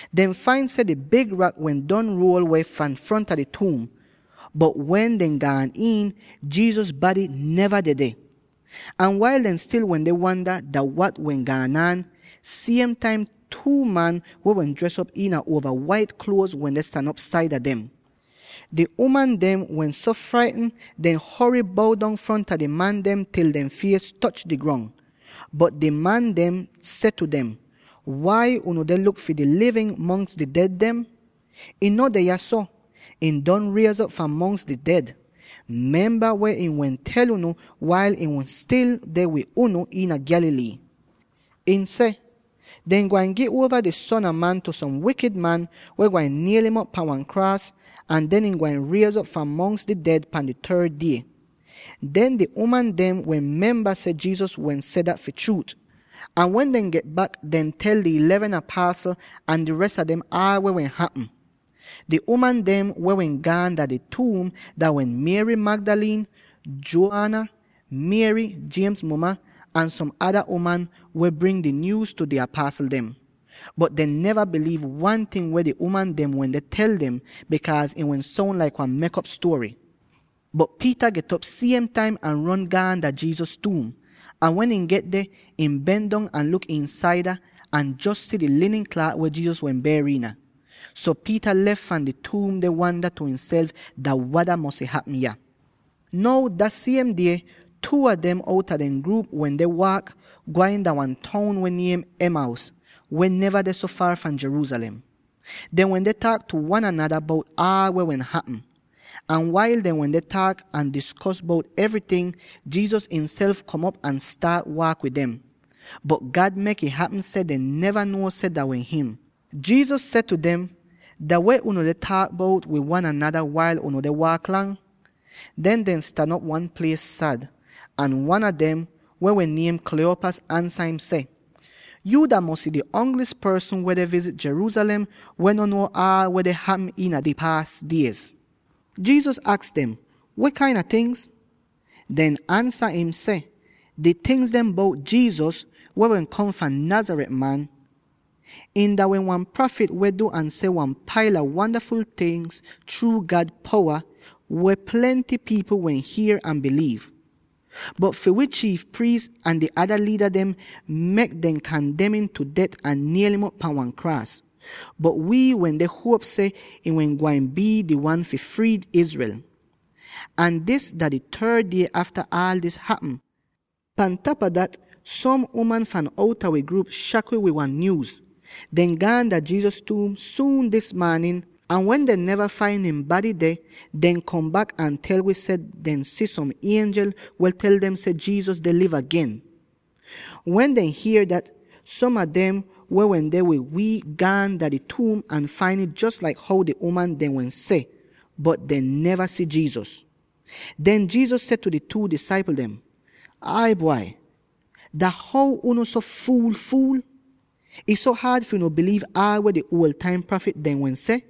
Dehn fain seh di big rak wehn don ruol weh fahn fronta di tuum, bot wen dehn gaan iin, Jesus bady neva dedeh! Ahn wail dehn stil wende wanda dah wada wehn gaan aan, siem taim two man, weh wehn dres op iina uova wait kluoz, wende stan op saida dem. Di uman dem wehn so fraitn, dehn hory bow dong fronta di man dem til dehn fies toch di grong. Bot di man dem seh tu dem, “Wai unu deh luk fi di livin mongs di ded dem? Ihn no deh yahso; ihn don riez'op fahn mongs di ded! Memba weh ihn wehn tel unu wail ihn wehn stil deh wid unu iina Galilee. Ihn seh, ‘Dehn gwain gi uova di Son a Man tu som wikid man, weh gwain niel'im op pan wan kraas, ahn den ihn gwain riez'op fahn mongs di ded pan di third die.’” Den di uman dem wehn memba seh Jesus wehn seh dat fi chruut. Ahn wen dehn get bak, dehn tel di eleven apasl, ahn di res a dem aal weh wehn hapm. Di uman dem weh wehn gaan dah di tuum dah wehn Mary Magdalene, Joanna, Mary —James muma— ahn som ada uman weh wehn bring dis nyuuz tu di apasl dem. Bot dehn neva biliiv wan ting weh di uman dem wende tel dem, bikaaz ih wehn soun laik wan mek'op stuory. [Bot Peter get'op siem taim ahn ron gaan dah Jesus tuum. Ahn wen ihn get deh, ihn ben dong ahn luk iinsaid ahn jos si di linin klaat weh Jesus wehn ber iina. So Peter lef fahn di tuum deh wanda tu ihnself dah wada mosy hapm yah.] Now dah siem die, two a dem outa dehn gruup wende waak, gwain dah wan toun weh niem Emmaus, weh neva deh so foor fahn Jerusalem. Dehn wende taak tu wan anada bout aal weh wehn hapm. Ahn wail dehn wende taak ahn diskos bout evryting, Jesus ihnself kom op ahn staat waak wid dem. Bot God mek'ih hapm seh dehn neva nuo seh dah wehn him. Jesus seh tu dem, “Dah weh unu deh taak bout wid wan anada wail unu deh waak lang?” Den dehn stan op wan plies sad, ahn wan a dem —weh wehn niem Cleopas— ansa im seh, “Yuu dah mosy di ongli'is porsn weh deh vizit Jerusalem weh no nuo aal weh deh hapm iina di paas diez.” Jesus aks dem, “Weh kain a tingz?” Dehn ansa im seh, “Di tingz bout Jesus, weh wehn kom fahn Nazareth, man. Ihn dah wehn wan prafit weh du ahn seh wan paila wandaful tingz chruu God powa, weh plenty pipl wehn hier ahn biliiv. Bot fi wi chiif priis ahn di ada liida dem mek dem kandem im tu det ahn niel'im op pan wan kraas. Bot wii wende huop seh him wehn gwain bii di wan fi frii Israel. Ahn dis dah di third die afta aal dis hapm. Pan tapa dat, som uman fahn outa wi gruup shak wi wid wan nyuuz. Dehn gaan dah Jesus tuum suun dis maanin; ahn wen dehn neva fain ihn bady deh, dehn kom bak ahn tel wi seh dehn si som ienjel weh tel dem seh Jesus deh liv agen! Wen dehn hier dat, som a dem weh wende wid wi gaan dah di tuum ahn fain ih jos laik how di uman dem wehn seh, bot dehn neva si Jesus.” Den Jesus seh tu di two disaipl dem, “Ai bwai, dah how unu so fuul-fuul? Ih so haad fi unu biliiv aal weh di uol taim prafit dem wehn seh?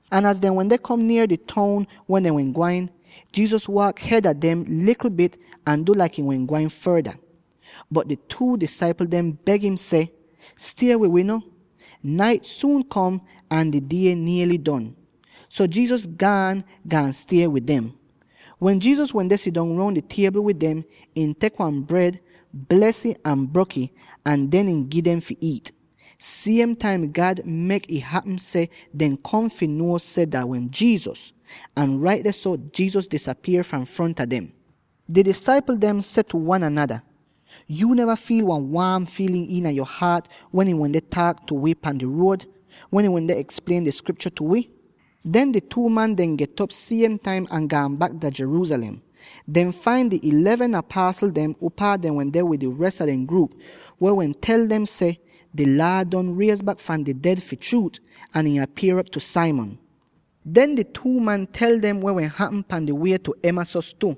Ahn az dehn wende kom nier di toun weh dehn wehn gwain, Jesus waak hed a dem likl bit ahn du laik ihn wehn gwain forda. Bot di two disaipl dem beg im seh, “Stie wid wi no. Nait suun kom, ahn di die niely don.” So Jesus gaan, gaan stie wid dem. Wen Jesus wende sidong roun di tiebl wid dem, ihn tek wan bred, bles ih ahn brok'ih, ahn den ihn gi dem fi iit. Siem taim God mek'ih hapm seh dehn kom fi nuo seh dah wehn Jesus; ahn rait dehso, Jesus disapier fahn fronta dem! Di disaipl dem seh tu wan anada, “Yuu neva fiil wan waam fiilin iina yo haat wen ihn wende taak tu wi pan di ruod, wen ihn wende eksplien di Skriptyo tu wi?” Den di two man dem get'op siem taim ahn gaan bak dah Jerusalem. Dehn fain di eleven apasl dem, upaa dehn wende wid di res a dehn gruup, weh wehn tel dem seh, “Di Laad don riez bak fahn di ded fi chruut, ahn ihn apier'op tu Simon!” Den di two man tel dem weh wehn hapm pan di wie tu Emmaus tu;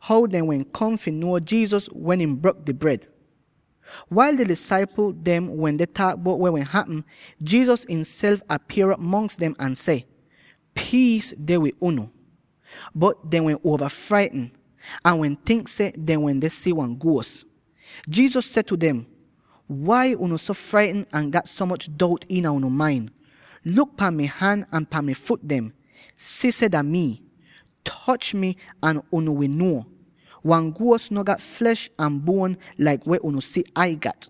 how dehn wehn kom fi nuo Jesus wen ihn brok di bred. Wail di disaipl dem wende taak bout weh wehn hapm, Jesus ihnself apier'op mongs dem ahn seh, “Piis deh wid unu!” Bot dehn wehn get uova fraitn, ahn wehn tink seh dehn wende si wan guos! Jesus seh tu dem, “Wai unu so fraitn ahn gat so moch dout iina unu main? Luk pan mi han ahn pan mi fut dem. Si seh dah mii! Toch mi ahn unu wi nuo. Wan guos no gat flesh ahn buon laik weh unu si Ai gat.”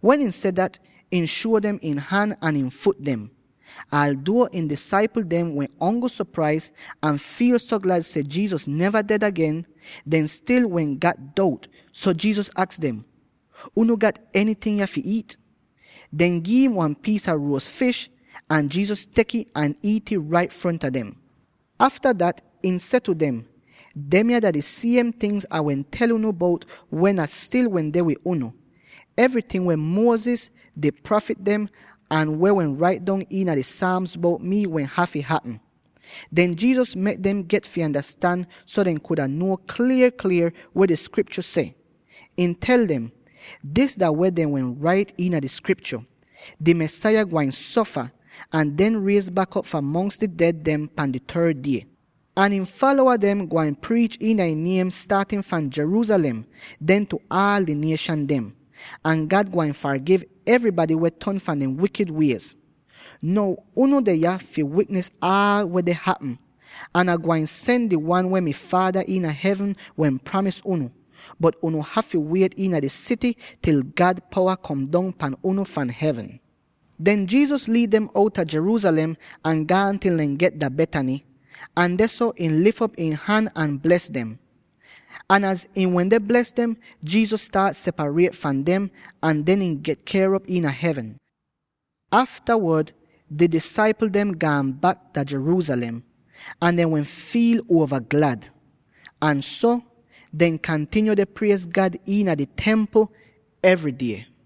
Wen ihn seh dat, ihn shuo dem ihn han ahn ihn fut dem. Alduo ihn disaipl dem wehn ongl sopraiz ahn fiil so glad seh Jesus neva ded agen, dehn stil wehn gat dout, so Jesus aks dem, “Unu gat enyting yah fi iit?” Dehn gi'im wan piis a ruos fish, ahn Jesus tek'ih ahn iit'ih rait fronta dem! Afta dat, ihn seh tu dem, “Demya dah di siem tingz Ah wehn tel unu bout wen Ah stil wende wid unu: evryting weh Moses, di prafit dem, ahn weh wehn rait dong iina di Psalms bout mii wehn hafy hapm.” Den Jesus mek dem get fi andastan so dehn kuda nuo klier-klier weh di Skriptyo seh. Ihn tel dem, “Dis dah weh dehn wehn rait iina di Skriptyo: ‘Di Mesaya gwain sofa, ahn den riez bak op fahn mongs di ded dem pan di third die. Ahn ihn falowa dem gwain priich iina ihn niem staatin fahn Jerusalem, den tu aal di nieshan dem. Ahn God gwain fargiv evrybady weh ton fahn dehn wikid wiez.’ “Now unu deh yah fi wiknis aal weh deh hapm, ahn Ah gwain sen di Wan weh mi Faada iina hevn wehn pramis unu. Bot unu hafy wiet iina di sity til God powa kom dong pahn unu fahn hevn.” Den Jesus liid dem outa Jerusalem ahn gaan til dehn get Bethany, ahn dehso ihn lif op ihn han ahn bles dem. Ahn az ihn wende bles dem, Jesus staat separiet fahn dem, ahn den ihn get ker'op dah hevn. Aftawod di disaipl dem gaan bak Jerusalem, ahn dehn wehn fiil uova glad. Ahn so, dehn kantinyo deh priez God iina di Templ evry die.